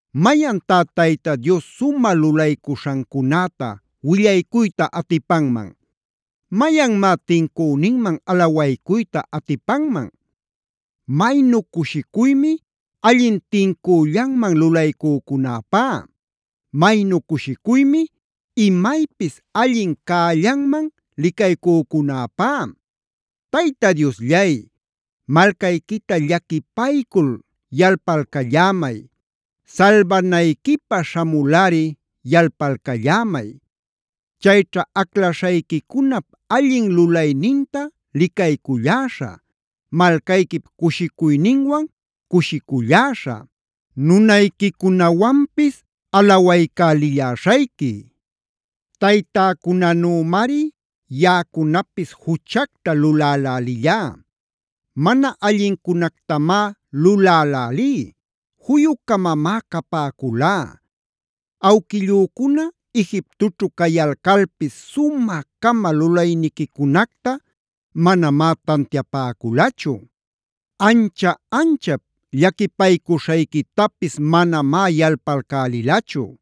¿Mayantá Tayta Dios sumä lulaycuśhancunäta willaycuyta atipanman?b ¿Mayanmá tincüninman alawaycuyta atipanman? Maynu cushicuymi allin tincüllanman lulaycücunäpá. Maynu cushicuymi imaypis allin cällanman licaycücunäpá. Tayta Diosllay, malcayquita llaquipaycul yalpalcallämay. Salbanayquipä śhamulꞌari yalpalcallämay. Chayćha aclaśhayquicunap allin lulayninta licayculläśhä, malcayquip cushicuyninwan cushiculläśhä, nunayquicunawanpis alawaycälilläśhayqui. Taytäcunanümari yaꞌacunapis juchacta lulälälillá. Mana allincunactamá lulälälí; juyu-camamá capäculá. Awquillücuna Egiptoćhu cayalcalpis sumä-cama lulayniquicunacta manamá tantiapäculachu. Ancha-anchap llaquipaycuśhayquitapis manamá yalpalcälilachu.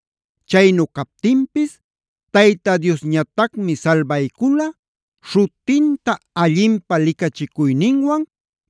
Chaynu captinpis Tayta Diosñatacmi salbaycula śhutinta allinpä licachicuyninwan,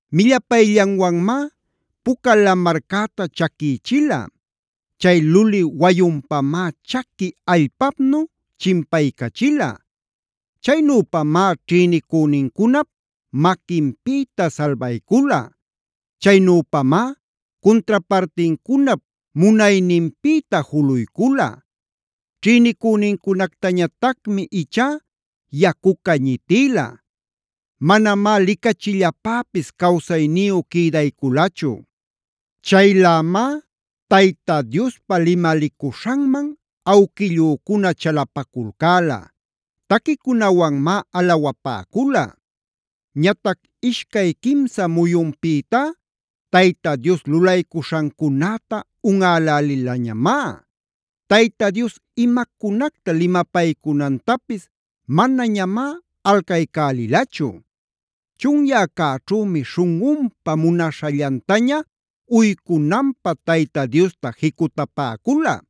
Millapayllanwanmá Puca Lamarcäta chaquïchila. Chay luli wayunpamá chaqui allpapnu chimpaycachila. Chaynüpamá ćhïnicünincunap maquinpïta salbaycula. Chaynüpamá cuntrapartincunap munayninpïta juluycula. Ćhïnicünincunactañatacmi ichá yacuca ñitïla. Manamá licachillapäpis cawsayniyu quïdayculachu. Chaylämá Tayta Diospa limalicuśhanman awquillücuna chalapaculcäla.e Taquicunawanmá alawapäcula. Ñatac ishcay quimsa muyunpïtá, Tayta Dios lulaycuśhancunäta unꞌälälilañamá. Tayta Dios imacunacta limapaycunantapis manañamá alcaycälilachu. Chunyäcäćhümi śhunꞌunpa munaśhallantaña uycunanpä Tayta Diosta jicutapäcula.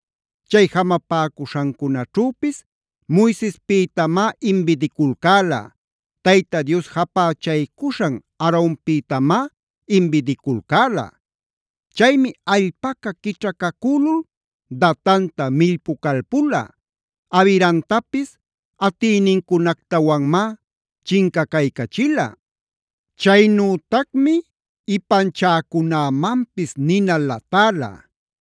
Chay jamapäcuśhancunaćhüpis Moisespïtamá imbidiculcäla. Tayta Dios japächaycuśhan Aaronpïtamá imbidiculcäla. Chaymi allpaca quićhacacülul Datanta millpucalpula. Abiramtapis atïnincunactawanmá chincacaycachila. Chaynütacmi ipanchäcunämanpis nina latäla.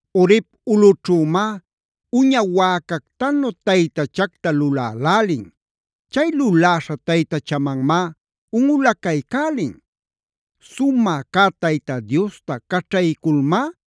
Horeb ulꞌućhümá uña wäcactanu taytachacta lulälälin. Chay luläśha taytachamanmá unꞌulacaycälin. Sumä cä Tayta Diosta caćhayculmá,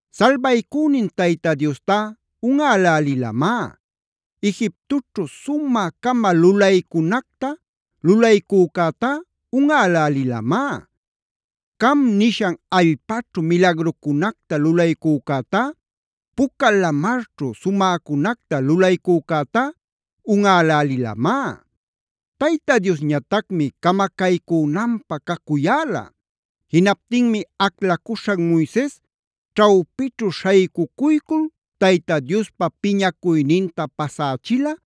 Salbaycünin Tayta Diostá unꞌälälilamá. Egiptoćhu sumä-cama lulaycunacta lulaycücätá unꞌälälilamá. Cam nishan allpaćhu milagrucunacta lulaycücätá, Puca Lamarćhu sumäcunacta lulaycücätá unꞌälälilamá. Tayta Diosñatacmi camacaycünanpä cacuyäla. Jinaptinmi aclacuśhan Moises ćhawpićhu śhaycucuycul Tayta Diospa piñacuyninta pasächila,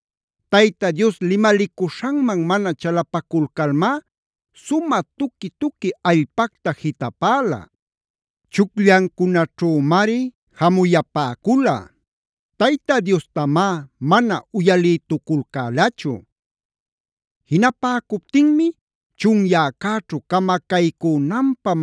Tayta Dios limalicuśhanman mana chalapaculcalmá sumä tuqui-tuqui allpacta jitapäla. Chucllancunaćhümari jamuyapäcula. Tayta Diostamá mana uyalïtuculcälachu. Jinapäcuptinmi chunyäcäćhu camacaycünanpä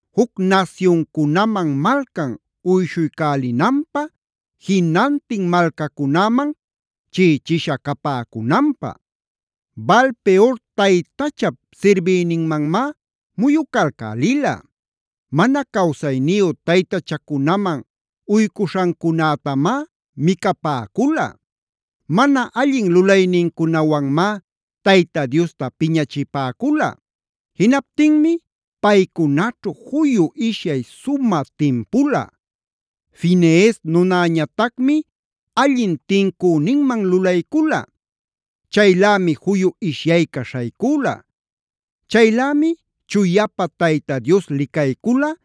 juc nasyuncunaman malcan uyshuycälinanpä,k jinantin malcacunäman chiꞌichisha capäcunanpä. Baal-peor taytachap sirbïninmanmá muyucalcälila. Mana cawsayniyu taytachacunaman uycuśhancunätamá micapäcula. Mana allin lulaynincunawanmá Tayta Diosta piñachipäcula. Jinaptinmi paycunaćhu juyu ishyay sumä timpula. Finees nunañatacmi allin tincüninman lulaycula. Chaylämi juyu ishyayca śhaycüla. Chaylämi chuyapä Tayta Dios licaycula,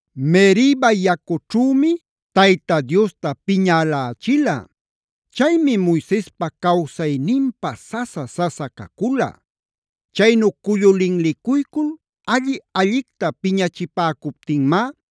Meriba yacućhümi Tayta Diosta piñälächila. Chaymi Moisespa cawsayninpä sasa-sasa cacula. Chaynu cullu linlicuycul alli-allicta piñachipäcuptinmá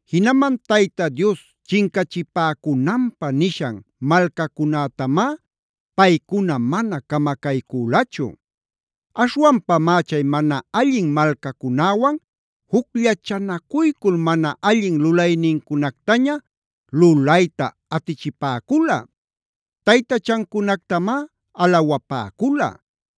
Jinaman Tayta Dios chincachipäcunanpä nishan malcacunätamá paycuna mana camacaycülachu. Aśhwanpamá chay mana allin malcacunäwan jucllachanacuycul mana allin lulaynincunactaña lulayta atichipäcula. Taytachancunactamá alawapäcula.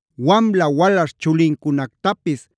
Wamla walaśh chulincunactapis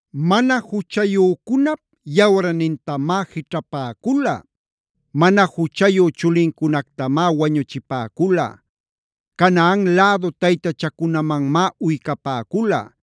Mana juchayücunap yawarnintamá jićhapäcula. Mana juchayu chulincunactamá wañuchipäcula. Canaan lädu taytachacunamanmá uycapäcula.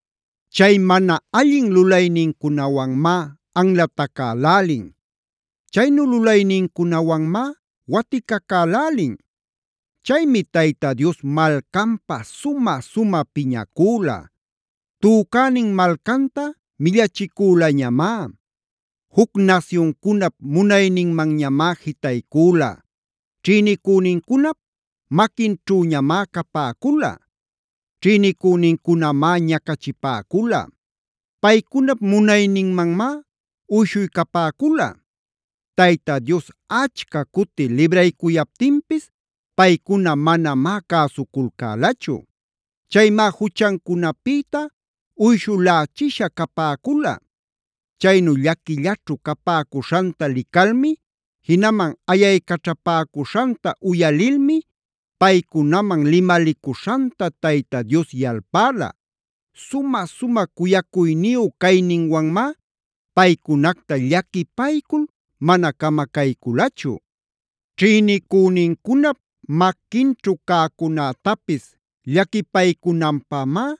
Chay mana allin lulaynincunawanmá anlatacälälin. Chaynu lulaynincunawanmá waticacälälin. Chaymi Tayta Dios malcanpä sumä-sumä piñacüla. Tücänin malcanta millachicülañamá. Juc nasyuncunap munayninmanñamá jitaycüla. Ćhïnicünincunap maquinćhüñamá capäcula. Ćhïnïcünincunamá ñacachipäcula. Paycunap munayninmanmá uyshuycapäcula. Tayta Dios achca cuti libraycuyaptinpis, paycuna manamá cäsuculcälachu. Chaymá juchancunapïta uyshulächisha capäcula. Chaynu llaquillaćhu capäcuśhanta licalmi, jinaman ayaycaćhapäcuśhanta uyalilmi, paycunaman limalicuśhanta Tayta Dios yalpäla. Sumä-sumä cuyacuyniyu cayninwanmá paycunacta llaquipaycul mana camacayculachu. Ćhïnicünincunap maquinćhu cäcunätapis llaquipaycunanpämá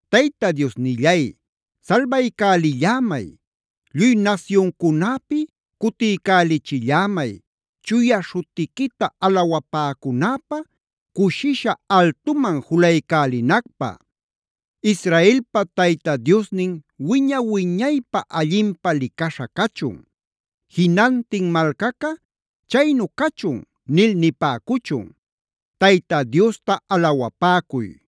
Tayta Diosnillay, salbaycälillämay. Lluy nasyuncunäpi cutiycälichillämay, chuya śhutiquita alawapäcunäpä, cushisha altuman julaycälinacpä. ¡Israelpa Tayta Diosnin wiña-wiñaypä allinpä licaśha cachun! Jinantin malcaca: “Chaynu cachun” nil nipäcuchun.r ¡Tayta Diosta alawapäcuy!